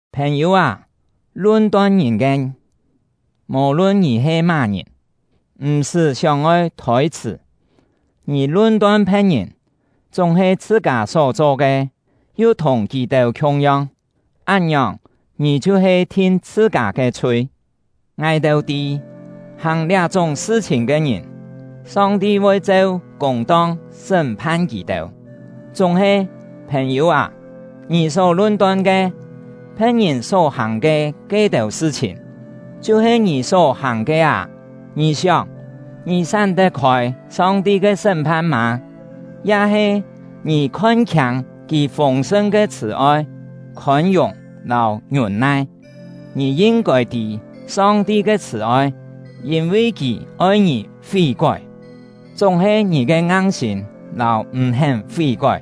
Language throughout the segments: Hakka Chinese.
Phèn-yû â, lun-ton ngìn ke, mò-lun ngì he má-ngìn, m̀-sṳ́ sióng-oi thôi-chhṳ̀. Ngì lun-ton phe̍t-ngìn, chúng-he chhṳ-kâ só-cho ke yu thùng kì-têu khiung-yong, án-ngiòng, ngì chhiu-he thin chhṳ-kâ ke chhui. Ngài-têu tî, hàng liá-chúng sṳ-chhìn ke ngìn, Song-ti voi cheu kûng-tong sṳ́m-phan kì-têu. Chúng-he, phèn-yû â, ngì só lun-ton ke, phe̍t-ngìn só-hàng ke ke-têu sṳ-chhìn, chhiu-he ngì só-hàng ke â! Ngì sióng, ngì sám tet-khôi Song-ti ke sṳ́m-phan mâ? Ya-he ngì khon-khiâng Kì fûng-sṳn ke chhṳ̀-oi, khôn-yùng lâu ngiûn-nai? Ngì yin-kôi tî Song-ti ke chhṳ̀-oi, yîn-vi Kì oi ngì fí-kói! Chúng-he ngì ke ngang-sîm lâu m̀-hén fí-kói,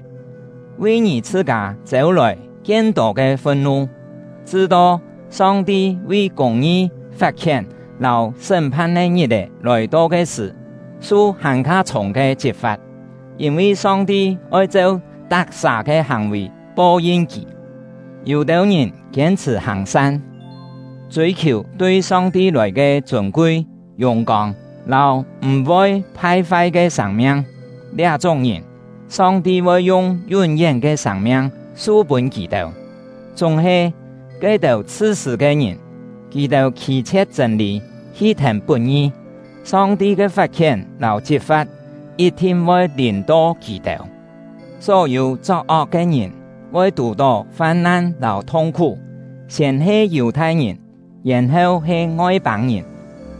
vi ngì chhṳ-kâ chêu-lòi kien-tô ke fun-nu, chṳ-to Song-ti vi kûng-ngi fat-khién lâu sṳ́m-phan ke ngit-è lòi-to ke sṳ̀, su hàn-kha chhûng ke chit-fa̍t. Yîn-vi Song-ti oi cheu tak-sà ke hàng-vì po-yin kì. Yû-têu ngìn kiên-chhṳ̀ hàng-san, chûi-khiù tui Song-ti lòi ke chûn-kui, yùng-kông, lâu m̀-voi phai-fai ke sâng-miang; liá-chúng ngìn, Song-ti voi yung yún-yén ke sâng-miang su pûn kì-têu. Chúng-he, ke-têu chhṳ-sṳ̂ ke ngìn, kì-têu khî-chhie̍t chṳ̂n-lî hi thèn put-ngi, Song-ti ke fat-khién lâu chit-fa̍t yit-thin voi lìm-to kì-têu. Só-yû chok-ok ke ngìn voi tù-tó fam-nan lâu thung-khú, siên he Yù-thai-ngìn, yèn-heu he Ngoi-pâng-ngìn.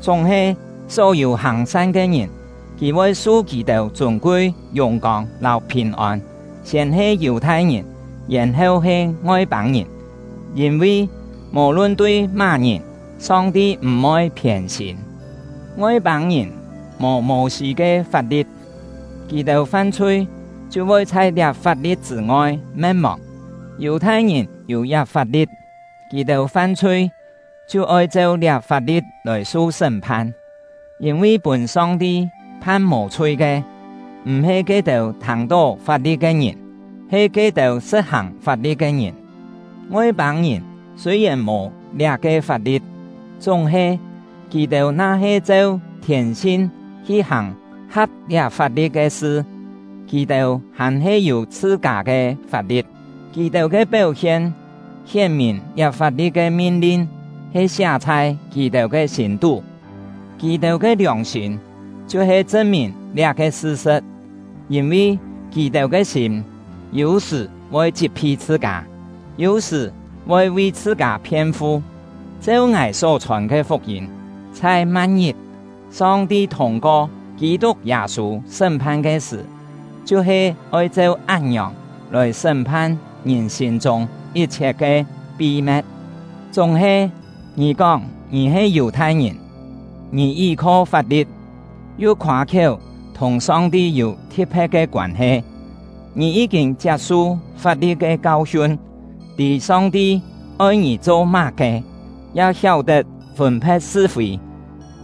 Chúng-he, só-yû hàng-san ke ngìn, Kì voi su kì-têu chûn-kui, yùng-kông lâu phìn-ôn, siên he Yù-thai-ngìn, yèn-heu he Ngoi-pâng-ngìn. Yîn-vi, mò-lun tui má-ngìn, Song-ti m̀-voi phiên-sîm. Ngoi-pâng-ngìn mò Mô-sî ke fap-li̍t, kì-têu fam-chhui chhiu voi chhai liá fap-li̍t chṳ̂-ngoi me̍t-mòng; Yù-thai-ngìn yû liá fap-li̍t, kì-têu fam-chhui chhiu oi cheu liá fap-li̍t lòi su sṳ́m-phan. Yîn-vi pûn Song-ti phan mò-chhui ke, m̀-he ke-têu thâng-tó fap-li̍t ke ngìn, he ke-têu sṳ̍t-hàng fap-li̍t ke ngìn. Ngoi-pâng-ngìn sûi-yèn mò liá-ke fap-li̍t, chúng-he, kì-têu na-he cheu thiên-sin hi hàng ha̍p liá fap-li̍t ke sṳ, kì-têu hàn-he yû chhṳ-kâ ke fap-li̍t. Kì-têu ke péu-hien hién-mìn liá fap-li̍t ke min-lin he siá chhai kì-têu ke sîm-tú; kì-têu ke liòng-sîm chhiu-he chṳn-mìn liá-ke sṳ-sṳ̍t; yîn-vi, kì-têu ke sîm yû-sṳ̀ voi chit-phi chhṳ-kâ, yû-sṳ̀ voi vi chhṳ-kâ phien-fu. Cheu ngài só-chhòn ke fuk-yîm, chhai ma̍t-ngit, Song-ti thûng-ko Kî-tuk Yâ-sû sṳ́m-phan ke sṳ̀, chhiu-he oi cheu án-ngiòng lòi sṳ́m-phan ngìn sîm-chûng yit-chhiet ke pi-me̍t. Chúng-he, ngì kóng ngì he Yù-thai-ngìn, ngì yí-kho fap-li̍t, yu khoâ-khiéu thùng Song-ti yû thi̍t-phe̍t ke koân-he. Ngì yí-kîn chiap-su fap-li̍t ke kau-hiun, tî Song-ti oi ngì cho má-ke, ya hiáu-tet fûn-phe̍t sṳ-fî.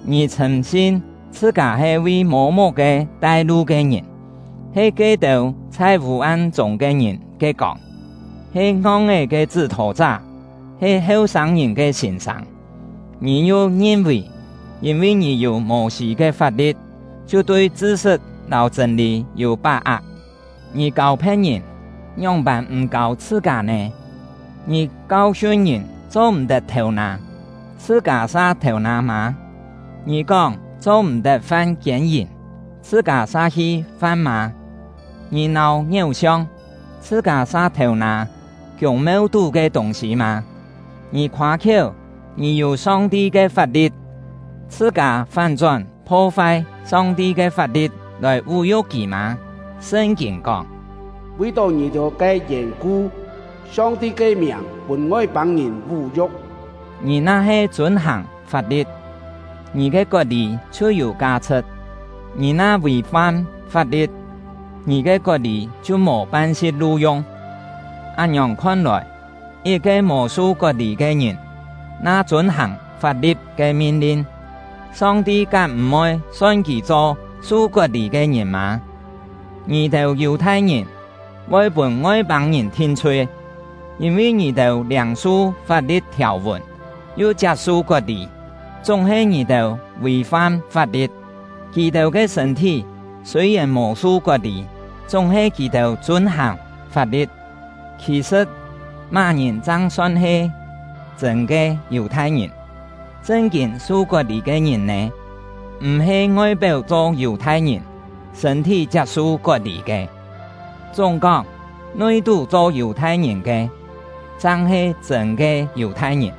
Ngì chhṳ̂m-sin chhṳ-kâ he vi mô-muk-ke tai-lu ke ngìn, he ke-têu chhai vû-am-chûng ke ngìn ke kông, he ngong-é ke chṳ́-thô-chá, he heu-sâng-ngìn ke sîn-sâng. Ngì yu ngin-vì, yîn-vi ngì yû Mô-sî ke fap-li̍t, chhiu tui chṳ-sṳt lâu chṳ̂n-lî yû pá-ak. Ngì kâu phe̍t-ngìn, ngióng-pân m̀ kâu chhṳ-kâ nè? Ngì kau-hiun ngìn cho-m̀-tet thêu-nâ, chhṳ-kâ sa thêu-nâ mâ? Ngì kóng cho-m̀-tet fam kiên-yìm, chhṳ-kâ sa hi fam mâ? Ngì nâu ngiéu-siong, chhṳ-kâ sa thêu-nâ kiûng-meu-tú ke tûng-sî mâ? Ngì khoâ-khiéu ngì yû Song-ti ke fap-li̍t, chhṳ-kâ fán-chón pho-fai Song-ti ke fap-li̍t lòi vú-yu̍k Kì mâ? Sṳn-kîn kóng: “Vi-tó ngì-têu ke yèn-ku, Song-ti ke miàng pûn Ngoi-pâng-ngìn vú-yu̍k.” Ngì na-he chûn-hàng fap-li̍t, ngì ke kot-lî chhiu yû ka-chhṳ̍t; ngì na vì-fam fap-li̍t, ngì ke kot-lî chhiu mò pan-si̍t lu-yung. Án-ngiòng khon-lòi, yit-ke mò su kot-lî ke ngìn na chûn-hàng fap-li̍t ke min-lin, Song-ti kám m̀-voi son kì cho su kot-lî ke ngìn mâ? Ngì-têu Yù-thai-ngìn voi pûn Ngoi-pâng-ngìn thin-chhui! Yîn-vi ngì-têu liâng-su fap-li̍t thiàu-vùn, yu chiap-su kot-lî, chúng-he ngì-têu vì-fam fap-li̍t; kì-têu ke sṳ̂n-thí sûi-yèn mò su kot-lî, chúng-he kì-têu chûn-hàng fap-li̍t. Khì-sṳ̍t, má-ngìn chang son he chṳ̂n ke Yù-thai-ngìn, chṳn-kîn su kot-lî ke ngìn nè? M̀-he ngoi-péu cho Yù-thai-ngìn, sṳ̂n-thí chiap-su kot-lî ke. Chúng-kóng, nui-tú cho Yù-thai-ngìn ke, chang he chṳ̂n ke Yù-thai-ngìn;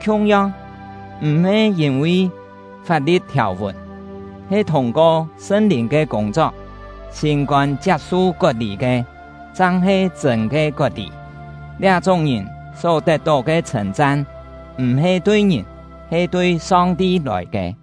khiung-yong, m̀-he yîn-vi fap-li̍t thiàu-vùn, he thûng-ko Sṳn-Lìn ke kûng-chok, sîm-kôn chiap-su kot-lî ke, chang he chṳ̂n ke kot-lî. Liá-chúng ngìn só tet-tó ke chhṳ̂n-chan, m̀-he tui ngìn, he tui Song-ti lòi ke.